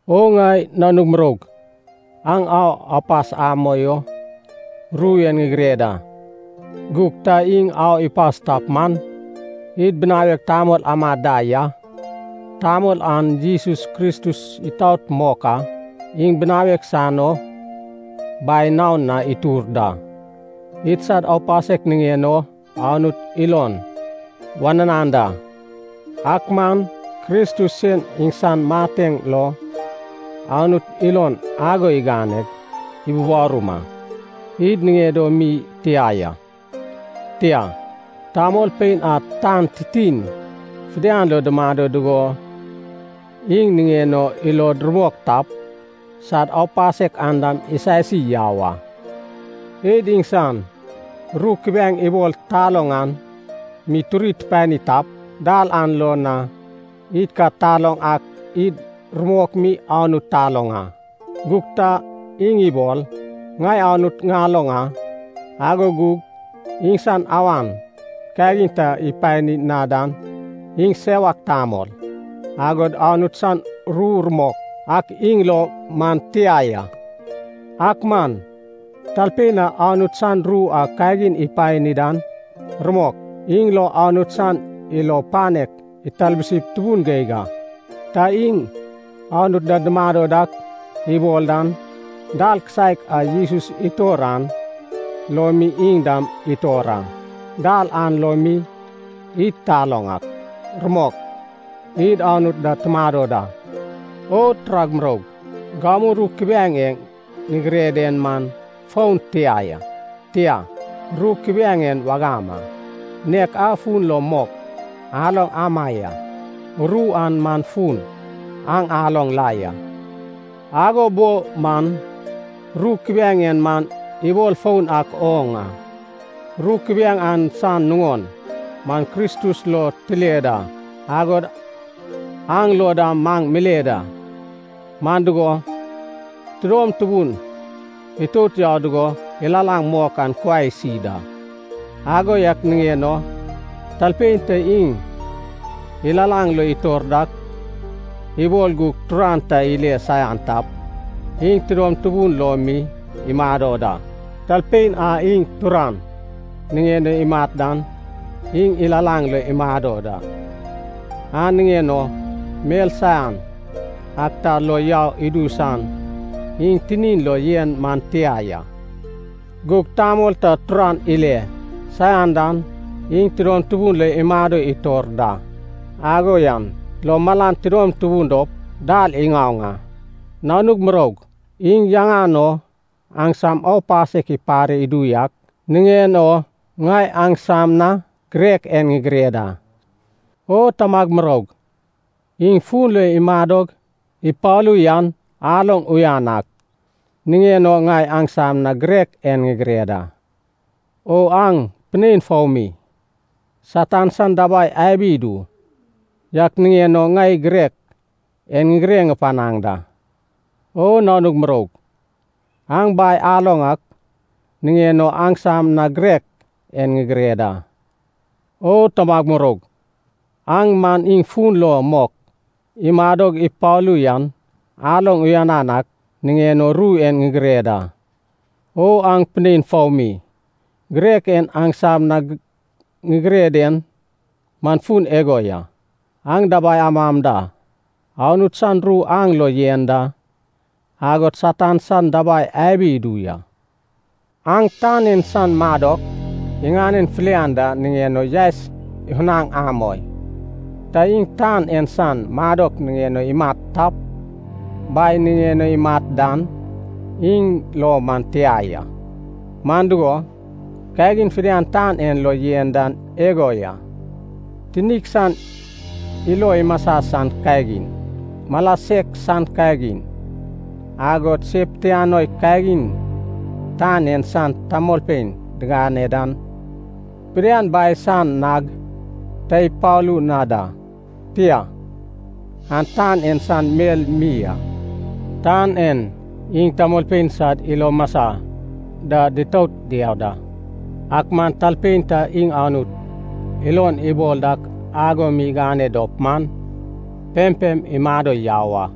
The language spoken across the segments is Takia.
O ŋai nanug muroug, aŋ au apas amoi o ru en ŋigire da. Gug ta iŋ au ipas tap man, id binawek tamol amad da ya. Tamol an Jesus Kristus itaot mok a. Iŋ ibinawad san o Bai naon na itur da. Idsad aupasek niŋen o Anut ilon wananan da. Ak man Kristus sen iŋsan mateŋ lo Anut ilon ago iganeg ibubarum a. Id niŋed o mi tia ya, tia, tamolpein a tan titin fidian lo dumado dugo iŋ niŋen o ilod rumok tap, sad aupasek an dam isasi yau a. Id iŋsan ru kubiaeŋ ibol taloŋ an mi turi tupani tap, dal an lo na id ka taloŋ ak id rumok mi Anut taloŋ a. Gug ta iŋ ibol, “Ŋai Anut ŋaloŋ a,” ago gug iŋsan awan kagin ta ipani na dan, iŋ sewak tamol, agod Anut san ru rumok ak iŋ lo man tia ya. Ak man talpein a Anut san ru a kagin ipani dan, rumok, iŋ lo Anut san ilo panek italbusip tubun geig a. Ta iŋ Anut da dumado dak ibol dan, dal kisaek a Jesus itor an lo mi iŋ dam itor a. Dal an lo mi id taloŋ ak, rumok, id Anut da tumado da. O turag muroug, gamu ru kubiaeŋ e ŋigire den man foun tia ya. Tia, ru kubiaeŋ en wagam a, nek a fun lo mok aloŋ ama ya. Ru an man fun aŋ aloŋ la ya. Ago bo man ru kubiaeŋ en man ibol foun ak oŋ a. Ru kubiaeŋ an san nuŋon man Kristus lo tile da, agod aŋ lo dam maŋ mile da. Man dugo, tudom tubun itout yau dugo ilalaŋ mok an kuai isi da. Ago yak niŋen o talpein ta iŋ ilalaŋ lo itor dak ibol gug turan ta ile saian tap, iŋ tidom tubun lo mi imado da. Talpein a iŋ turan niŋen o imat dan iŋ ilalaŋ lo imado da. An niŋen o mel saian ak ta lo yau idu san iŋ tinin lo yen man tia ya. Gug tamol ta turan ile saian dan iŋ tudom tubun lo imado itor da. Ago yan lo malan tidom tubun dop dal iŋaoŋ a. Nanug muroug, iŋ yaŋan o, aŋsam aupasek ipare idu yak niŋen o ŋai aŋsam na girek en ŋigire da. O tamag muroug, iŋ fun lo imadog ipalu yan aloŋ uyan ak niŋen o ŋai aŋsam na girek en ŋigire da. O aŋ pinein foumi, Satan san dabai abi idu yak niŋen o ŋai girek en ŋigire panaŋ da. O nanug muroug, aŋ Bai aloŋ ak niŋen o aŋsam na girek en ŋigire da. O tamag muroug, aŋ man iŋ fun lo mok imadog ipalu yan aloŋ uyanan ak niŋen o ru en ŋigire da. O aŋ pinein foumi, girek en aŋsam na ŋigire den man fun igo ya, aŋ dabai amam da, Anut san ru aŋ lo yen da, agod Satan san dabai abi idu ya. Aŋ tan en san madok iŋanen filian da niŋen o yaes ifunaŋ amoi. Ta iŋ tan en san madok niŋen o imat tap, Bai niŋen o imat dan, iŋ lo man tia ya. Man dugo, kagin fidian tan en lo yen dan igo ya, tinik san ilo imasa san kagin, mala sek san kagin, agod se pitianoi kagin tan en san tamolpein digane dan, fidian Bai san nag ta ipalu na da, tia, an tan en san mel mi a. Tan en iŋ tamolpein sad ilo masa da ditout diau da. Ak man talpein ta iŋ Anut ilon ibol dak ago mi igane dop man, pempem imado yau a.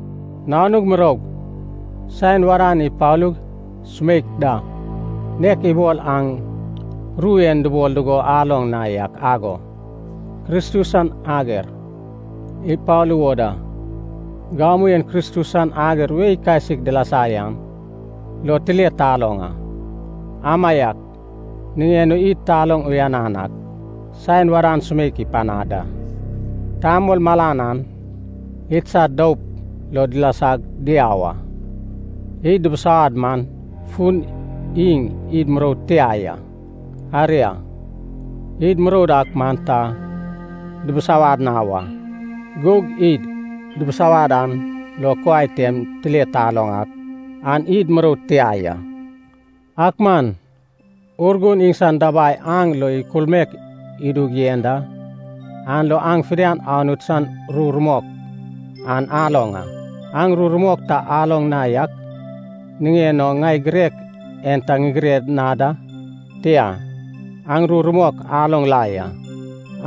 Nanug muroug, saen wadan ipalug sumeik da. Nek ibol aŋ ru en dubol dugo aloŋ na yak ago, Kristus san ager ipalu wo da, gamu en Kristus san ager wei kasik dilasa yan lo tile taloŋ a. Amaiak niŋen o id taloŋ uyan ak saen wadan sumeik ipanad da. Tamol malan an idsad doup lo dilasag diau a. Iŋ dubusawad man fun iŋ id muroud tia ya. Aria id muroud ak man ta dubusawad na wa. Gug id dubusawad an lo kuai tem tile taloŋ ak, an id muroud tia ya. Ak man Urgun iŋsan dabai aŋ lo ikulmaek idug yen da, an lo aŋ fidian Anut san ru rumok an aloŋ a. Aŋ ru rumok ta aloŋ na yak niŋen o ŋai girek en ta ŋigire na da. Tia, aŋ ru rumok aloŋ la ya,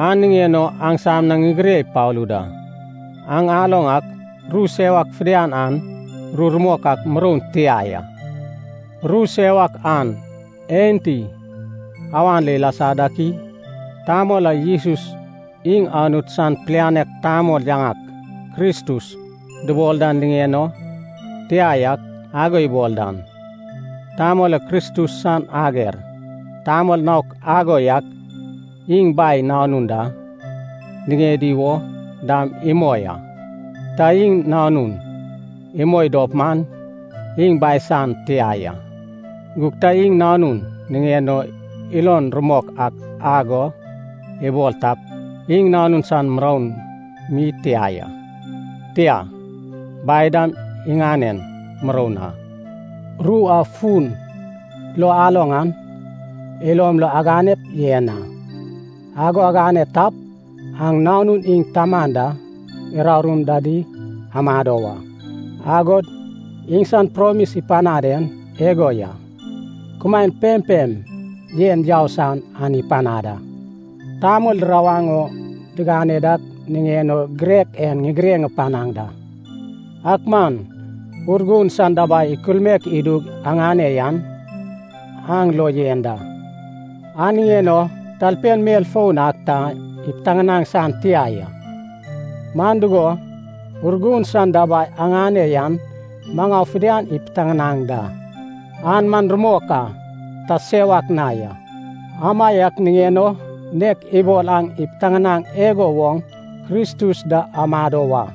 an niŋen o aŋsam na ŋigire ipalu da. Aŋ aloŋ ak ru sewak fidian an ru rumok ak muroun tia ya. Ru sewak an enti awan lo ilasa dak i? Tamol a Jesus iŋ Anut san pilianek tamol yaŋak “Kristus” dubol dan niŋen o “tia yak” ago ibol dan, tamol an Kristus san ager. Tamol naok ago yak iŋ Bai Nanun da niŋedi wo dam imoi a. Ta iŋ Nanun imoi dop man iŋ Bai san tia ya. Gug ta iŋ Nanun niŋen o ilon rumok ak ago ibol tap, iŋ Nanun san muroun mi tia ya, tia, Bai dam iŋanen muroun a. Ru a fun lo aloŋ an ilom lo aganep yen a. Ago agane tap, aŋ Nanun iŋ Taman da urarum dadi amado wa. Agod iŋsan promis ipanad en igo ya, kumaen pempem yen yau san an ipanad a. Tamol dirawaŋ o digane dak niŋen o girek en ŋigire panaŋ da. Ak man Urgun san dabai ikulmaek idug aŋane yan, aŋ lo yen da. An niŋen o talpein mel foun ak ta ipiteŋanaŋ san tia ya. Man dugo, Urgun san dabai aŋane yan maŋau fidian ipiteŋanaŋ da. An man rumok a, ta sewak na ya, amaiak niŋen o nek ibol aŋ ipiteŋanaŋ igo woŋ Kristus da amado wa.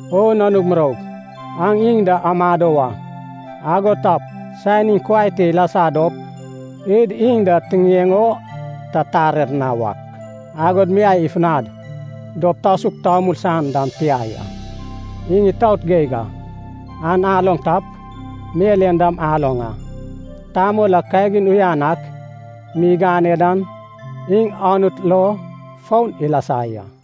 O nanug muroug, aŋ iŋ da amado wa. Ago tap, saen iŋ kuai te ilasa dop id iŋ da tiŋiŋeŋ o ta tarer na wak, agod miai ifunad dop tasuk tamul san dam tia ya. Iŋ itaot geig ak an aloŋ tap, mel en dam aloŋ a, tamol a kagin uyan ak mi igane dan iŋ Anut lo foun ilasa ya.